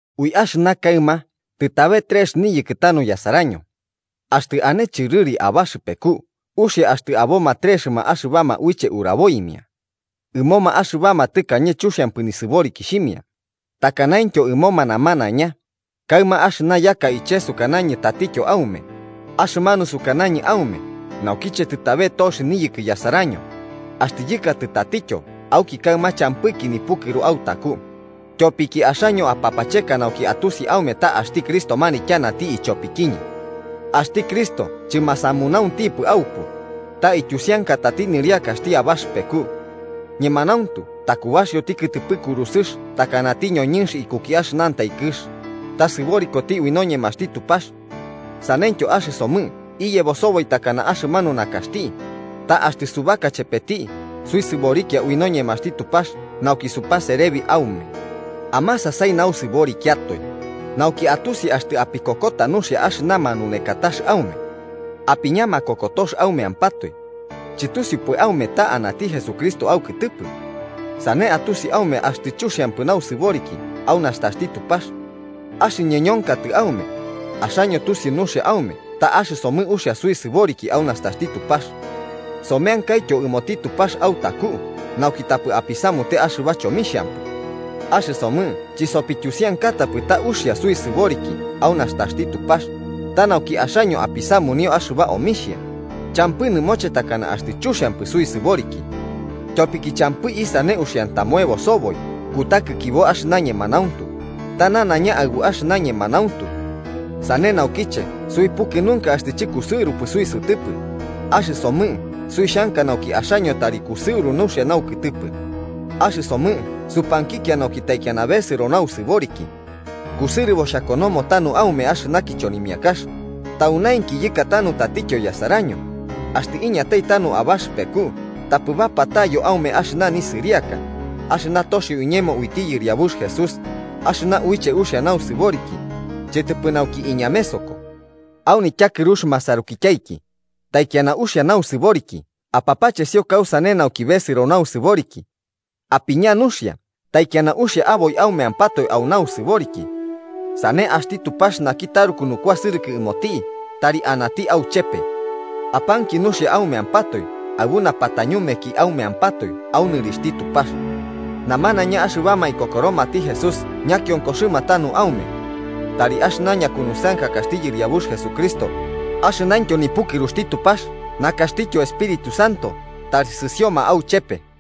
Ui axɨna kaɨma tɨtabe trex niyɨkɨ tanu yasaraño. Axtɨ ane chɨrɨri abaxɨpeku uxia axtɨ aboma trexɨma axɨbama uiche uraboimia. Ɨmoma axɨbama tɨkañe chuxiampɨ nisɨborikixhimia, takanaintyo ɨmoma namanaiña, kaɨma axɨna yaka iche sukanañɨ tatityo aume, axɨmanu sukanañɨ aume naukiche tɨtabe tox niyɨkɨ yasaraño: axtɨ yɨkatɨ tatityo auki kaɨma champɨki nipukɨru autaku, tyopiki axaño apapacheka nauki atusi aume ta axti Cristo manityanati ichopikiñɨ. Axti Cristo chɨmasamunaunxtipɨ aupu, ta ityusiankatati nɨriakaxti abaxɨpeku. Ñemanauntu takubaxioti kɨtɨpɨ kurusɨx takanati ñoñɨnx ikuki axɨnantai kɨx, ta sɨborikoti ui noñemaxti Tupax. Saneityo axɨsomɨ iyebo soboi takana axɨmanu nakaxti, ta axtɨ subaka chepeti suisɨborikia ui noñemaxti Tupax nauki supaserebi aume. Amasasai nausɨborikiatoe, nauki atusi axtɨ apikokota nuxia axɨna manunekatax aume. Apiña makokotox aumeampatoe. ¿Chɨtusiupɨ aume ta anati Jesucristo aukɨtɨpɨ? ¡Sane atusi aume axtɨ chuxiampɨ nausɨboriki au nastaxti Tupax! Axɨñɨ ñonkatɨ aume, axaño tusiu nuxia aume ta axɨsomɨ uxia suisɨboriki au nastaxti Tupax. Someankaityo ɨmoti Tupax autaku nauki tapɨ apisamute axɨba chomixhampɨ. Axɨsomɨ chisopityusiankatapɨ ta uxia suisɨboriki au nastaxti Tupax, ta nauki axaño apisamunio axɨba omixhia, champɨ nɨmoche takana axtɨ chuxiampɨ suisɨboriki. Tyopiki champɨ isane uxiantamoebo soboi kutakikibo axɨna ñemanauntu, ta nanaiña aɨbu axɨna ñemanauntu. Sane naukiche suipɨkɨnunka axtɨ chɨkusɨurupɨ suisɨtɨpɨ, axɨsomɨ suixanka nauki axaño tari kusɨuru nuxia naukɨtɨpɨ. Axɨsomɨ supankikia nauki taikiana besɨro nausɨboriki. Kusɨrɨbo xhakonomo tanu aume axɨna kichonimiakax, taunainki yɨkatanu tatityo yasaraño, axtɨ iñatai tanu abaxɨpeku tapɨ bapatayo aume axɨna nisɨriaka, axɨna toxio iñemo uiti Yɨriabux Jesús, axɨna uiche uxia nausɨboriki, chɨtɨpɨ nauki iñamesoko. Au nityakɨrux masarukityaiki, taikiana uxia nausɨboriki apapachesio kausane nauki besɨro nausɨboriki. Apiña nuxia taikiana uxia aboi aumeampatoe au nausɨboriki. Sane axti Tupax naki taruku nukuasɨrɨkɨ ɨmoti tari anati auchepe. Apanki nuxia aumeampatoe aɨbu napatañumeki aumeampatoe au nɨrixhti Tupax. Namanaiña axɨbama ikokoromati Jesús ñakionkoxɨma tanu aume. Tari axɨna ñakunusɨankakaxti Yɨriabux Jesucristo, axɨnaintyo nipukɨruxti Tupax nakaxtityo Espíritu Santo tari sɨsioma auchepe.